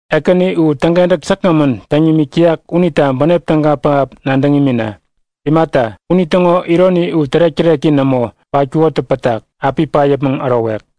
Ekäni u täŋkentäk säkgämän täŋ nimik täyak unita bänep täga pähap nadäŋ imina! Imata, unitäŋo ironi u tärek-täreki nämo patkukotä pätak, api pat yäpmäŋ ärowek.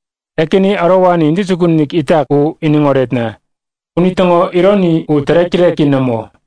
Ekäni ärowani intäjukun-inik itak u iniŋ oretna! Unitäŋo ironi u tärek-täreki nämo.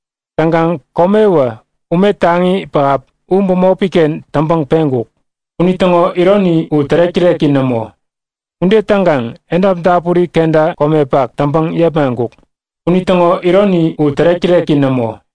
Täŋkaŋ komewä ume taŋi pähap u bämopiken täŋpäŋ peŋkuk. Unitäŋo ironi u tärek-täreki nämo. Ude täŋkaŋ edap dapuri kenta komepak täŋpäŋ yepmaŋkuk. Unitäŋo ironi u tärek-täreki nämo.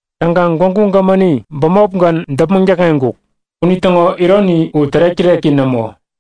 Täŋkaŋ Gwägu Gämäni bämopgän däpmäŋ täkŋeŋkuk. Unitäŋo ironi u tärek-täreki nämo.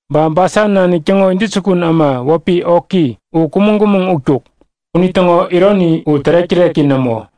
Ba Basan nanik täŋo intäjukun äma wäpi Oki u kumäŋ-kumäŋ utkuk. Unitäŋo ironi u tärek-täreki nämo.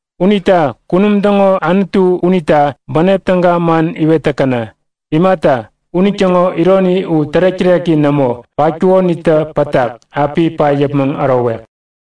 Unita Kunum täŋo Anutu unita bänep täga man iwet täkäna! Imata, unitäŋo ironi u tärek-täreki nämo patkukonitä pätak, api pat yäpmäŋ ärowek.